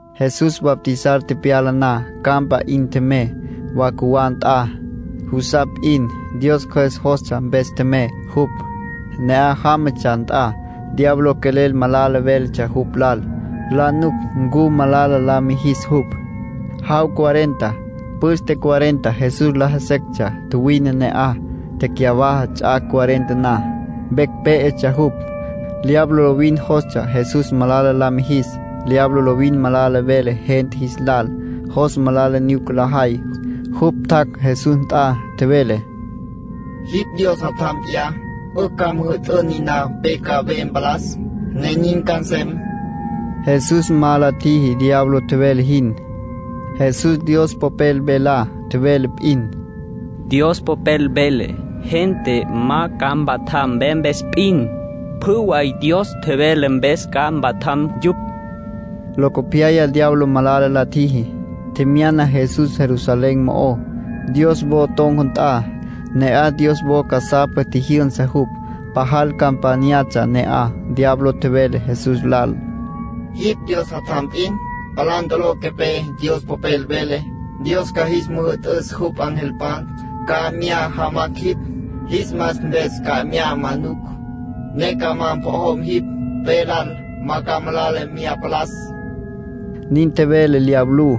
Jesús bautizar tepyala na, campa 'in tjemey, wa cjuwá nt'a, jusapj p'in. Dios Cjües jostsja mpes tjemey jupj. Ne'aj jámatsja nt'a, diablo quelel malala véletsja jupj lal, la nuc ncu malala la mijis jupj. Jaw cuarenta, püste cuarenta Jesús laja sectsja tjuwine ne'aj. Tecyawaja ts'ac' cuarenta na, vecj pé'etsja jupj. Diablo lovin jostsja Jesús malala la mijis. Diablo lovin malala vele gente jis lal, jos malala nyuca lajay. Jupj tjac' Jesús nt'a, tjevele: —Jipj Dios Jatjam p'iyá, 'ücj ca müjü'tün niná pe ca ve mpalas, ne nin ca nsem. Jesús ma la tjiji diablo tjevele jin. Jesús Dios Popel velá tjevele p'in. —Dios Popel vele: ‘Gente ma ca mpatjam ve mpes p'in. Pjü way Dios tjevelá mpes ca mpatjam yupj’ —tjevele. Locopyaya diablo malala la tjiji, tjemyana Jesús Jerusalén mo'ó, Dios wo ton̈ca nt'a. Ne'aj Dios wo casapa tjijyünsa jupj. Pajal campányatsja ne'aj. Diablo tjevele Jesús lal: —Jipj Dios Jatjam p'in, palá ntolo quepé. Dios Popel vele: ‘Dios ca jis müjü'tüs jupj angelpan, ca mya jamacj jipj. Jis mas mpes ca mya ma'nucj, ne ca ma mpojom jipj, pe lal. Ma ca malala mya palas’ —nin tjevele diablú.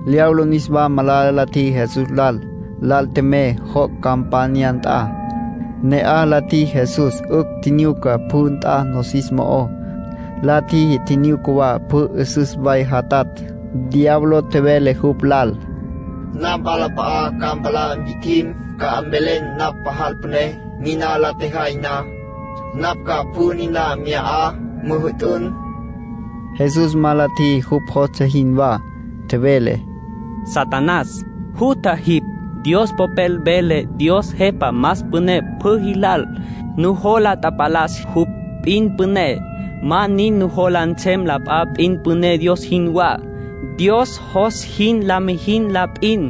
Diablo niswa malala la tjiji Jesús lal. Lal tjemey joc' campanya nt'a. Ne'aj la tjiji Jesús 'ücj tjinyuca pjü nt'a nosis mo'ó. La tjiji tjinyuca wa pjü 'üsüs way jatatj. Diablo tjevele jupj lal: —Napj nawalap'a'a ca palá mpi'tjim, ca mvelen napj pajal püné. Niná la tjejay na, napj ca pjü niná mya 'a müjü'tün. Jesús ma la tjiji jupj jostsja jinwá. Tjevele: —Satanás, jutja jipj. Dios Popel vele: ‘Dios jepa más püné pjü jilal. Nujola tapalas jupj p'in püné. Ma nin nujola nsem la p'a p'in püné Dios jinwá. Dios jos jin la müjí la p'in.’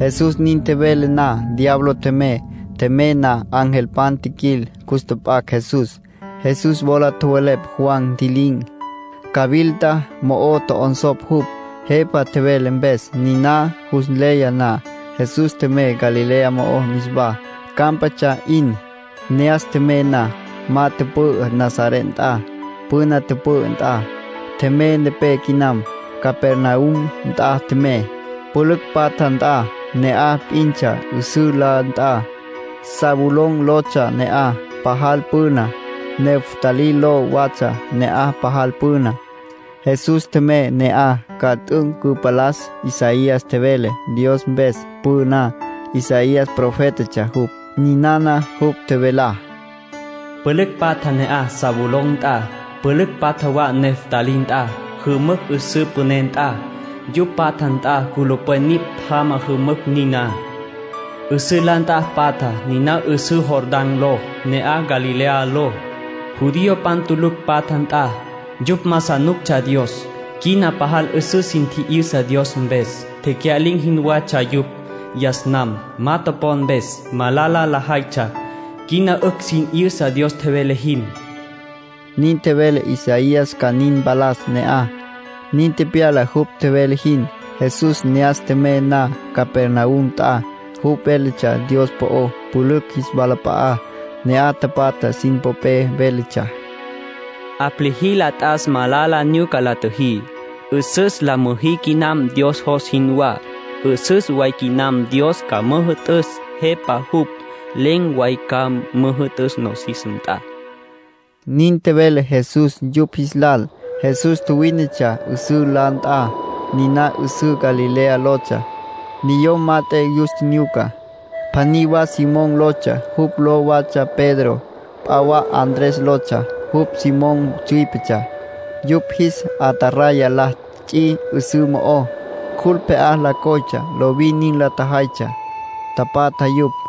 Jesús nin tjevele na, diablo tjemey. Tjemey na, angelpan tjiquil, cus tjap'acj Jesús. Jesús wola tjowelepj Juan ntji'lin̈, cawilta mo'o tjo'onsopj jupj, jepa tjevele mpes. Niná jus nleya na, Jesús tjemey Galilea mo'ó niswá, cámpatsja 'in. Ne'as tjemey na, ma tüpü'ü Nazaret nt'a, püna tüpü'ü nt'a. Tjemey nepé quinam, Capernaum nt'a tjemey, pülücj patja nt'a. Ne'aj p'intsja 'üsǘ la nt'a, Zabulón lotsja ne'aj pajal püna. Neftalí ló watsja ne'aj pajal püna. Jesús tjemey ne'aj ca t'üc' cüpalas Isaías tjevele Dios mpes püná. Isaías profétatsja jupj. Ninana jupj tjevelá: “Pülücj patja ne'aj Zabulón nt'a. Pülücj patja wa Neftalí nt'a. Jümücj 'üsǘ püné nt'a, yupj patja nt'a culupwen nipj jama jümücj niná. 'Üsǘ la nt'a patja, niná 'üsǘ Jordán ló. Ne'aj Galilea ló, judiopan tulucj patja nt'a. Yupj ma sa nuctsja Dios. Quina pajal 'üsüs sin tji'yüsa Dios mpes. Tecya'lin̈ jinwatsja yupj yas nam, ma topon mpes. Malala lajaytsja. Quina 'ücj sin 'yüsa Dios tjevele jin.” Nin tjevele Isaías ca nin mpalas ne'aj. Nin tepyala jupj tjevele jin. Jesús ne'as tjemey na Capernaum nt'a, jupj véletsja Dios po'ó pülücj jis walap'a'á, ne'aj tapatja sin popé. Véletsja: “'Aplijila t'as malala nyuca la tjüjí. 'Üsüs la müjí quinam Dios jos jinwá. 'Üsüs way quinam Dios ca müjü'tüs. Jepa jupj. Len̈ way ca müjü'tüs nosis nt'a”, nin tjevele Jesús yupj jis lal. Jesús tjuwínetsja 'üsǘ la nt'a. Niná 'üsǘ Galilea lotsja. Ne'aj wínetsja na, niyom mat'e yus tjinyuca. Pjaní wa Simón lotsja. Jupj ló watsja Pedro. P'a wa Andrés lotsja. Jupj Simón tsüípetsja. Yupj jis ataraya la ts'i 'üsǘ mo'ó. Cjul pje'á la coytsja. Lovin nin lajaytsja, tapatja yupj.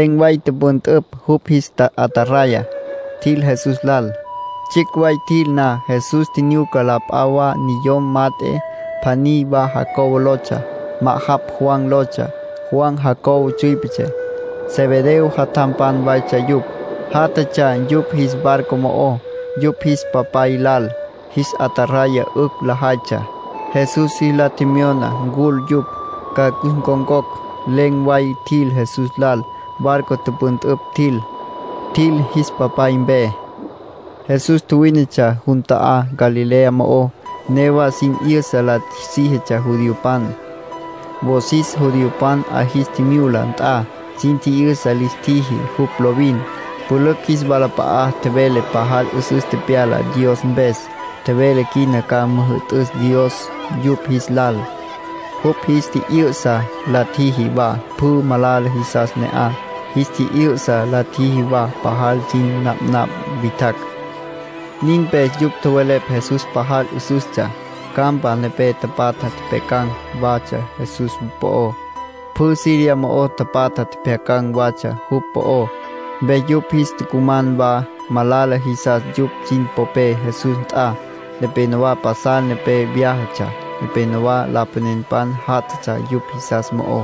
Len̈ way tüpüntüpj yupj jis ataraya, tjil Jesús lal. Tsjicj way tjil na, Jesús tjinyuca la p'a wa niyom mat'e. Pjaní wa Jacobo lotsja. Ma'ajapj Juan lotsja. Juan Jacobo tsüípetsja. Zebedeo jatjampan waytsja yupj. Játjatsja yupj jis barco mo'ó, yupj jis papay lal. Jis ataraya 'ücj lajaytsja. Jesús jis la tjemyona ncul yupj, ca cus ncon̈cocj. Len̈ way tjil Jesús lal. Barco tüpüntüpj tjil. Tjil jis papay mpe. Jesús tjuwínetsja jun ta'á Galilea mo'ó. Newa sin 'yüsa la síjitsja judiopan. Wosis judiopan 'a jis tjimyula nt'a sin tji'yüsa lis tjiji jupj lovin. Pülücj jis walap'a'a tjevele pajal 'üsüs tepyala Dios mpes. Tjevele quina ca müjü'tüs Dios yupj jis lal. Jupj jis tji'yü'sa la tjiji wa pjü malala jisas ne'aj. Jis tji'yü'sa la tjiji wa pajal sin napnapj witjacj. Nin mpes yupj tjowelepj Jesús pajal 'üsüstsja. Campa nepé tapatja tjepjyacan̈ watsja Jesús po'ó. Pjü Siria mo'o tapatja pjyacan̈ watsja jupj po'ó. Mpes yupj jis tucuman wa malala jisas yupj sin popé Jesús nt'a. Nepénowa pasal nepé vyájatsja. Nepénowa lapanenpan jatjatsja yupj jisas mo'ó.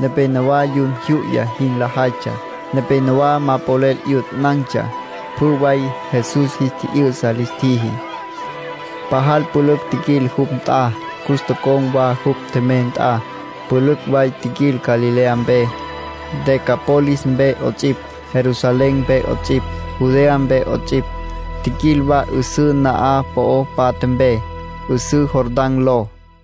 Nepénowa yun jyu'ya jin lajaytsja. Nepénowa ma polel 'yutanan̈tsja. Pjü way Jesús jis tji'yü'sa lis tjiji. Pajal pülücj tjiquil jupj nt'a. Cus tocon̈ wa jupj tjemey nt'a. Pülücj way tjiquil Galilea mpe, Decápolis mpe 'ots'ipj, Jerusalén mpe 'ots'ipj, Judea mpe 'ots'ipj. Tjiquil wa 'üsǘ na'aj po'ó patja mpe, 'üsǘ Jordán ló.